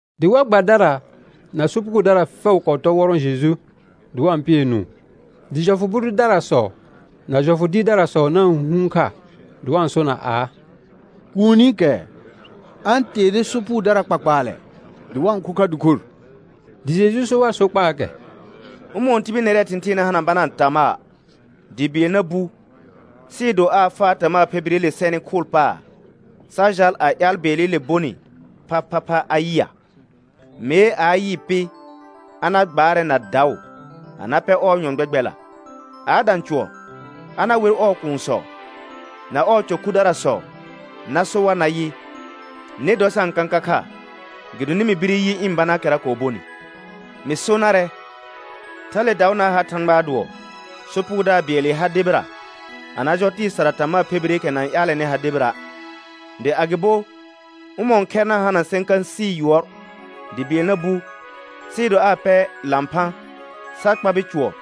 Dɩ war gbadara na sopugodara fɛʋ kɔɔ tɔr wɔrɔ̃ Jeju, dɩ wa-n pɩɛ nũu. Dɩ jɔfʋ bʋ dʋdarasɔ na jɔfʋ dɩɩrdarasɔ na-n hũhuun kha dɩ wa-n sona aa: Kuunikɛ a-n teere sopugodara kpakpaalɛ dɩ wa-n kho kha dɩkor. Dɩ Jeju so war sokpaakɛ: Ʋmɔ̃ɔ tibil nɛrɛɛ thɩ̃thɩɩn na hana banaa tamaa dɩ bɩɛl na bu, sɩɩ do aa faa tamaa phe bireele sɛnɩ khʋʋl paar, sa jal a ƴaal bɩɛlɩle bonɩ phaphapha a yɩa'. Mee a a yɩɩ pɩ, a na gbaarɛ na daʋ a na pɛ ɔɔ nyɔ̃ gbɛgbɛlla. A a dã cʋɔr, a na wer ɔɔ kuunsɔ na ɔɔ cɔ khudarasɔ na so war nayɩ: Nɩ dɔ sa-n kãka kha, gɩdonɩ mɩ bire yɩ ɩ̃ banaakɛra kɔɔ bonɩ. Mɩ so narɛ, thale daʋ na ha Thãgbaa dʋɔ sopugodaar bɩɛlɩ ha debira, a na jɔ tɩɩ sara tamaa phe bireekɛ na-n ƴaalɛnɩ ha debira'. Dɩ agɩbo, ʋmɔ̃ɔ khɛr na hana sẽkãsɩ yʋɔr dɩ bɩɛl na bu, sɩɩ do aa pɛ lãphã sa kpabɩ cʋɔr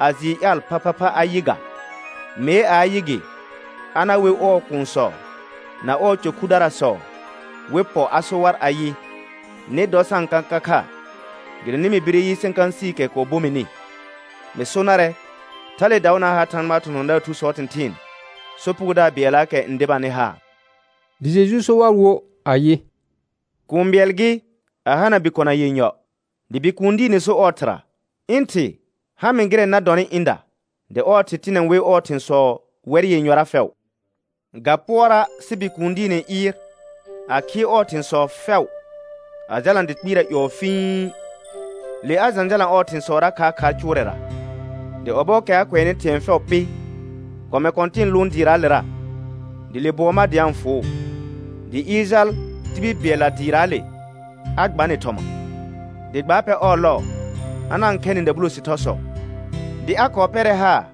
a jɩɩ ƴaal phaphapha a yɩ ga? Mee a a yɩ gɩ, a na wer ɔɔ kuunsɔ na ɔɔ cɔ khudarasɔ wɩ pɔ a so war ayɩ: Nɩ dɔ sa-n kãka kha, gɩdonɩ mɩ bire yɩ sẽkãsɩɩkɛ kɔɔ bo mɩnɩ. Mɩ so narɛ, thale daʋ na ha Thãgbaa thɔ̃thɔ̃daar thusɔɔ thɩ̃thɩɩn sopugodaar bɩɛllaakɛ n debanɩ haar. Dɩ Jeju so war wo ayɩ: Kũu bɩɛl gɩ, a hana bikona yenyɔ. Dɩ bikũu diine so ɔɔ thɩra: Ɩ̃ thɩ, ha mɩ gɩrɛ na dɔnɩ ɩ̃da. Dɩ ɔɔ thɩ tɩnɛ wɩ ɔɔ thɩ̃sɔ wɛr yenyɔra fɛʋ. Ga pʋɔra' sɩ bikũu diine ɩɩr a khɩɩ ɔɔ thɩ̃sɔ fɛʋ, a jalna dɩ kpɩɩra ƴɔɔ fĩi. Le a jãjalã ɔɔ thɩ̃sɔra khaarkhaar cʋʋrɛra. Dɩ ɔbɔɔkɛ a kʋɛnɩ thɩ̃ɛ fɛʋ pɩ, kɔmɛ kɔ̃tɩ̃ɩ lʋʋn dɩɩraalera, dɩ le bʋɔ ma dɩ a-n fʋʋ. Dɩ ɩɩr jal tibil bɩɛlla dɩɩraale a gba nɩ thɔma, dɩ gbaa pɛ ɔɔ lɔɔ a na-n khɛ nɩ dabulo sɩthɔsɔ. Dɩ a kɔɔ pɛrɛ haar,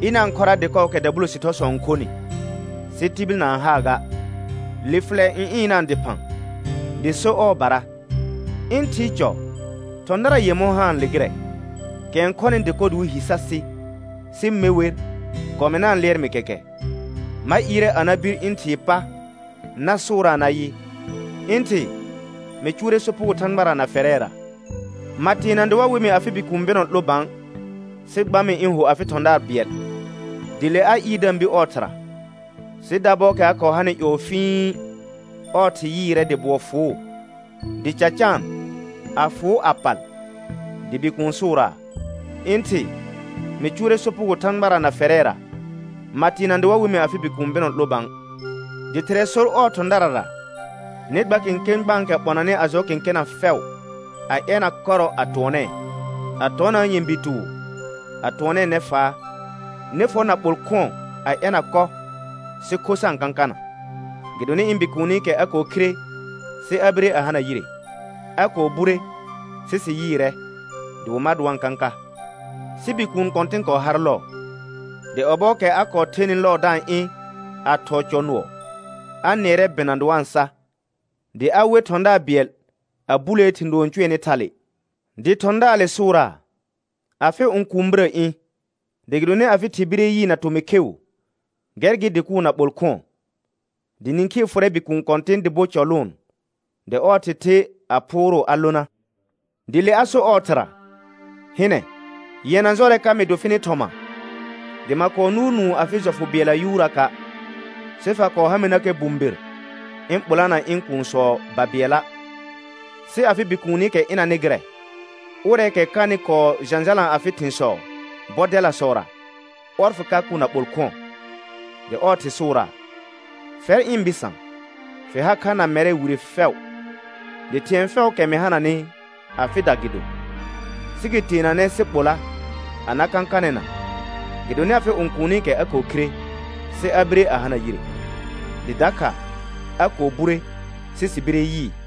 ɩna-n khɔra dɩkɔɔkɛ dabulo sɩthɔsɔ n khonɩ, sɩ tibil na-n haa ga. Le fɩlɛ n ɩnaa dɩphã, dɩ so ɔɔbara: Ɩ̃ thɩɩ cɔ thɔ̃dara yemɔ̃ haanle gɩrɛ, kɛ n khɔnɩ dɩkɔ dɩ wɩ hi sa sɩ, sɩ me wer, kɔmɛr na-n lɩɛr mɩ kɛkɛ. Ma ɩɩrɛ a na bir ɩ̃ thɩɩ pa na sʋʋraa nayɩ: Ɩ̃ thɩ, mɩ cʋʋrɛ sopugo Thãgbara na fɛrɛra. Ma teena dɩ wa we mɩ afɩ bikũu bɩnɔ 'lo bã, sɩ gba mɩ ɩ̃ ho afɩ thɔ̃daar bɩɛl. Dɩ le a ɩɩr da-n bir ɔɔ thɩra. Sɩ dabɔɔkɛ a kɔɔ hanɩ ƴɔɔ fĩi, ɔɔ thɩ yɩɩrɛ dɩ bʋɔ fʋʋ, dɩ ca caan a fʋʋ a pal. Dɩ bikuun sʋʋraa: Ɩ̃ thɩ, mɩ cʋʋrɛ sopugo Thãgbara na fɛrɛra, ma teena dɩ wa we mɩ afɩ bikũu bɩnɔ 'lo bã. Dɩ thɩrɛ sor ɔɔ thɔ̃darara: Nɩ gba kẽkẽ gbãakɛ ɓɔnanɩ a jɔ kẽkena fɛʋ, a ɛna kɔrɔ a tʋɔnɛɛ, a tɔnaa nyɛ̃bi tʋʋ a tʋɔnɛɛ nɛfaa. Nɩ fɔ naɓol khʋ̃ɔ a ɛna kɔ, sɩ kho sa-n kãkana, gɩdonɩ ɩ̃ bikuunikɛ a kɔɔ khire sɩ a bire a hana yire. A kɔɔ bure sɩ sɩ yɩɩrɛ. Dɩ wɩ mar dɩ wa-n kãka. Sɩ bikũu kɔ̃tɩn kɔɔ har lɔɔ. Dɩ ɔbɔɔkɛ a kɔɔ thenɩ lɔɔ da-n ɩ̃ a thɔɔ cɔ nʋɔ, a nɩɛrɛ bɩna dɩ wa-n sa. Dɩ a wer thɔ̃daar bɩɛl a bulee thɩ̃ doo n cʋɛnɩ thale. Dɩ thɔ̃daarde sʋʋraa: Afɩ õkuun birə ɩ̃, dɩ gɩdonɩ afɩ thɩ bire yɩɩ na tomɩ kheu, gɛr gɩ dɩ kʋʋ naɓol khʋ̃ɔ. Dɩ nĩkhii fʋrɛ bikũu kɔ̃tɩn dɩ bo cɔ lʋʋn. Dɩ ɔɔ thɩ the a phʋʋrʋʋ a lona. Dɩ le a so ɔɔ thɩra: Hɩnɛ, yɛna jɔrɛ ka mɩ do fɩnɩ thɔma, dɩ ma kɔɔ nʋʋr nũu afɩ jɔfʋ bɩɛlla yuuraka', sɩ fa kɔɔ ha mɩnakɛ bʋ̃bir ɩ̃ ɓolana ɩ̃ kuunsɔ babɩɛla'. Sɩ afɩ bikuunikɛ ɩnanɩ gɩrɛ, ʋrɛɛkɛ kanɩ kɔɔ jãjalã afɩ thɩ̃sɔ bɔdɛlasɔra, ɔr fɩ ka kʋ naɓol khʋ̃ɔ. Dɩ ɔɔ thɩ sʋʋraa: Fɛr ɩ̃ bɩsã, fɩ har kha na mɛrɛ wire fɛʋ, dɩ thɩ̃ɛ fɛʋʋkɛ mɩ hananɩ afɩda gɩ do. Sɩ gɩ teenanɛ sɩ ɓola a na kãkanɛna, gɩdonɩ afɩ õkuunikɛ a kɔɔ khire, sɩ a bire a hana yire, dɩ dakha a kɔɔ bure, sɩ sɩ bire yɩɩ.